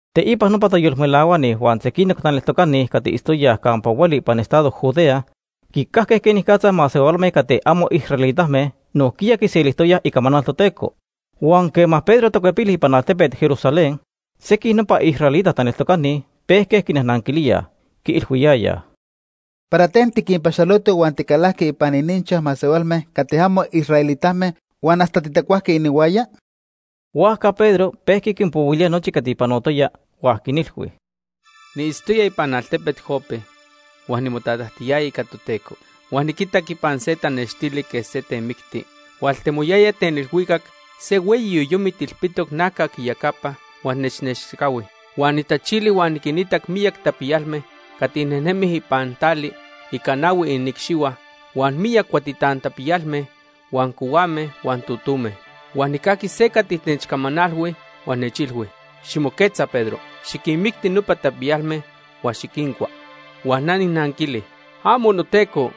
Teipa nopa tayolmelahuani huan sequinoc taneltocani cati itztoyaj campa hueli ipan estado Judea quicajque quenicatza masehualme cati amo israelitame nojquiya quiselijtoyaj icamanal Toteco. Huan quema Pedro tacuepili ipan altepet Jerusalén, sequij nopa israelita taneltocani pejque quinajnanquilíaj. Quiilhuiyayaj: ―¿Para ten tiquinpaxoloto huan ticalajqui ipan ininchaj masehualme cati amo israelitame huan hasta titacuajqui inihuaya? Huajca Pedro pejqui quinpohuilía nochi cati panotoya huan quinilhui: ―Niitztoya ipan altepet Jope huan nimotatajtiyaya ica Toteco. Huan niquitac ipan se tanextili quej se temicti, hualtemoyaya ten ilhuicac se hueyi yoyomit ilpitoc najcac iyecapa huan nechnechcahui. Huan nijtachili huan niquinitac miyac tapiyalme cati nejnemij ipan tali ica nahui iniicxihua, huan miyac cuatitan tapiyalme, huan cohuame huan totome. Huan nijcajqui se cati nechcamanalhui huan nechilhui: ‘Ximoquetza Pedro, xiquinmicti nopa tapiyalme huan xiquincua.’ “Huan na nijnanquili: ‘¡Amo, noTeco!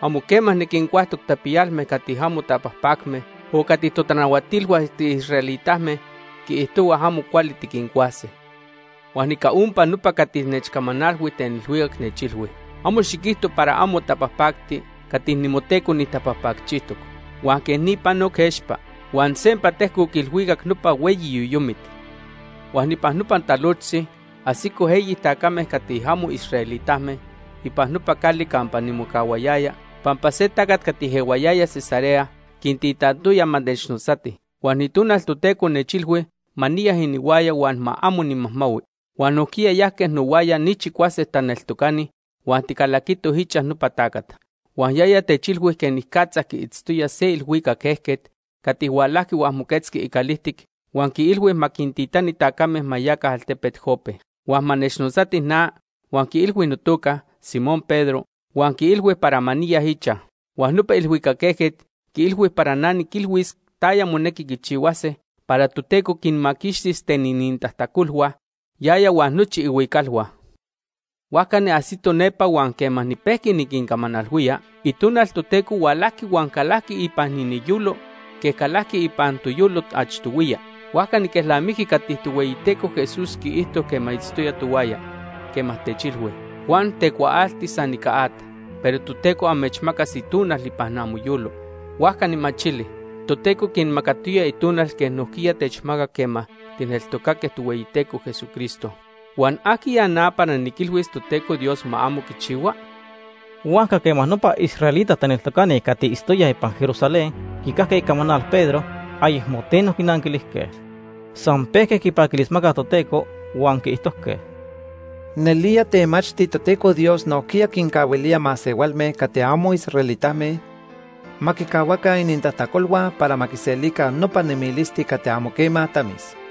Amo quema niquincuajtoc tapiyalme cati amo tapajpacme o cati totanahuatilhua tiisraelitame quiijtohuaj amo cuali tiquincuase.’ “Huan ica ompa nopa cati nechcamanalhui ten ilhuicac nechilhui: ‘Amo xiquijto para amo tapajpacti cati nimoTeco nijtapajpacchijtoc.’ Huan quej ni panoc expa huan sempa tejcoc ilhuicac nopa hueyi yoyomit. “Huan ipan nopa talojtzi ajsitoj eyi tacame cati amo israelitame ipan nopa cali campa nimocahuayaya pampa se tacat cati ehuayaya Cesarea quintitantoya ma nechnotzatij. Huan Itonal Toteco nechilhui ma niya inihuaya huan ma amo nimajmahui. Huan nojquiya yajque nohuaya ni chicuase taneltocani huan ticalaquitoj ichaj nopa tacat. Huan yaya techilhui quenicatza quiitztoya se ilhuicac ejquet cati hualajqui huan moquetzqui icalijtic huan quiilhui ma quintitani tacame ma yaca altepet Jope, huan ma nechnotzatij na huan quiilhui notoca, Simón Pedro, huan quiilhui para ma niya ichaj. Huan nopa ilhuicac ejquet quiilhui para na niquilhuis taya monequi quichihuase para Toteco quinmaquixtis ten inintajtacolhua, yaya huan nochi ihuicalhua. “Huajca niajsito nepa huan quema nipejqui niquincamanalhuía, Itonal Toteco hualajqui huan calajqui ipan iniyolo quej calajqui ipan toyolo achtohuiya. Huajca niquelnamijqui cati Tohueyiteco Jesús quiijto quema itztoya tohuaya, quema techilhui: ‘Juan tecuaalti san ica at, pero Toteco amechmacas Itonal ipan amoyolo.’ Huajca nijmachili, Toteco quinmacatoya Itonal quej nojquiya techmacac quema tijneltocaque Tohueyiteco Jesucristo. Huan ¿ajquiya na para niquilhuis Toteco Dios ma amo quichihua?” Huajca quema nopa israelita taneltocani cati itztoyaj ipan Jerusalén quicajque icamanal Pedro, ayecmo teno quinanquilijque. San pejque quipaquilismacaj Toteco huan quiijtojque: ―Nelía temachti Toteco Dios nojquiya quincahuilía masehualme cati amo israelitame ma quicahuaca inintajtacolhua para ma quiselica nopa nemilisti cati amo quema tamis.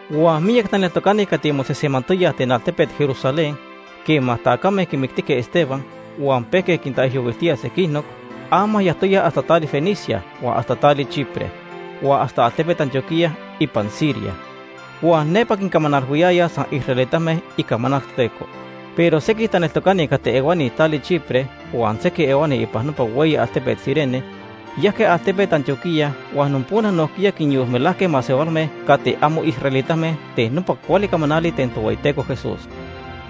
Huan miyac taneltocani cati mosejsemantoyaj ten altepet Jerusalén quema tacame quimictijque Esteban huan pejque quintaijyohuiltíaj sequinoc, ama yajtoyaj hasta tali Fenicia, huan hasta tali Chipre huan hasta altepet Antioquía ipan Siria. Huan nepa quincamanalhuiyayaj san israelitame icamanal Toteco. Pero sequij taneltocani cati ehuani tali Chipre huan sequij ehuani ipan nopa hueyi altepet Cirene, yajque altepet Antioquía huan nopona nojquiya quinyolmelajque masehualme cati amo israelitame ten nopa cuali camanali ten Tohueyiteco Jesús.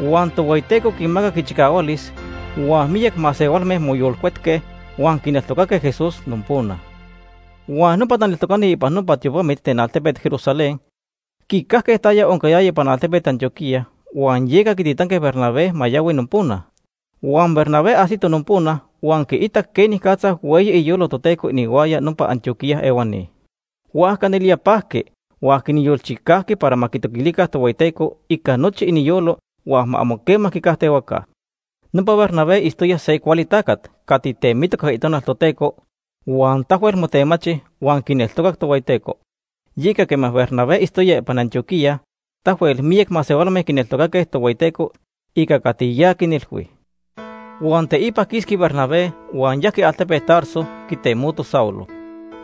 Huan Tohueyiteco quinmacac ichicahualis, huan miyac masehualme moyolcuetque huan quineltocaque Jesús nopona. Huan nopa taneltocani ipan nopa tiopamit ten altepet Jerusalén quicajque taya oncayaya ipan altepet Antioquía, huan yeca quititanque Bernabé ma yahui nopona. Huan Bernabé ajsito nopona huan quiitac quenicatza hueyi iyolo Toteco inihuaya nopa Antioquía ehuani. Huajca nelía pajqui huan quinyolchicajqui para ma quitoquilica Tohueyiteco ica nochi iniyolo huan ma amo quema quicajtehuaca. Nopa Bernabé itztoya se cuali tacat cati temitoc ica Itonal Toteco huan tahuel motemachi huan quineltocac Tohueyiteco. Yeca quema Bernabé itztoya ipan Antioquía tahuel miyac masehualme quineltocaque Tohueyiteco ica cati ya quinilhui. Huan teipa quisqui Bernabé huan yajqui altepet Tarso quitemoti Saulo.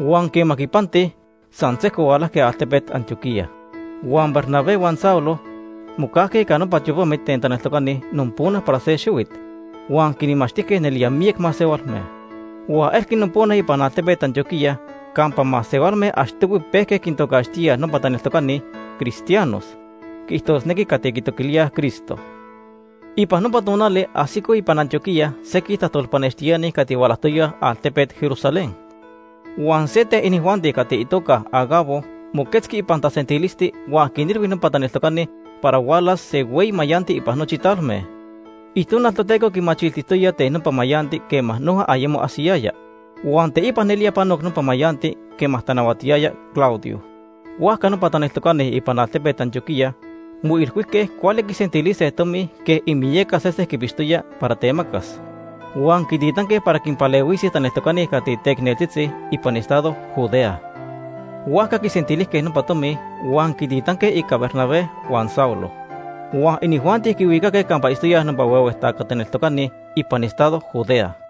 Huan quema quipanti, san sejco hualajque altepet Antioquía. Huan Bernabé huan Saulo mocajque ica nopa tiopamit ten taneltocani nopona para se xihuit huan quinmachtijque nelía miyac masehualme. Huan elqui nopona ipan altepet Antioquía campa masehualme achtohui pejque quintocaxtíaj nopa taneltocani “cristianos”, quiijtosnequi, cati quitoquilíaj Cristo. Ipan nopa tonali ajsicoj ipan Antioquía sequij tajtolpanextiani cati hualajtoyaj altepet Jerusalén. Huan se ten inijuanti cati itoca Agabo moquetzqui ipan tasentilisti huan quinilhui nopa taneltocani para hualas se hueyi mayanti ipan nochi talme. Itonal Toteco quimachiltijtoya ten nopa mayanti quema noja ayemo ajsiyaya. Huan teipa nelía panoc nopa mayanti quema tanahuatiyaya Claudio. Huajca nopa taneltocani ipan altepet Antioquía moilhuijque cuali quisentilise tomi quej imiyaca sesen quipixtoya para temacas. Huan quititanque para quinpalehuise taneltocani cati teicneltzitzi ipan estado Judea. Huajca quisentilijque nopa tomi huan quititanque ica Bernabé huan Saulo. Huan inijuanti quihuicaque campa itztoyaj nopa huehue taca taneltocani ipan estado Judea.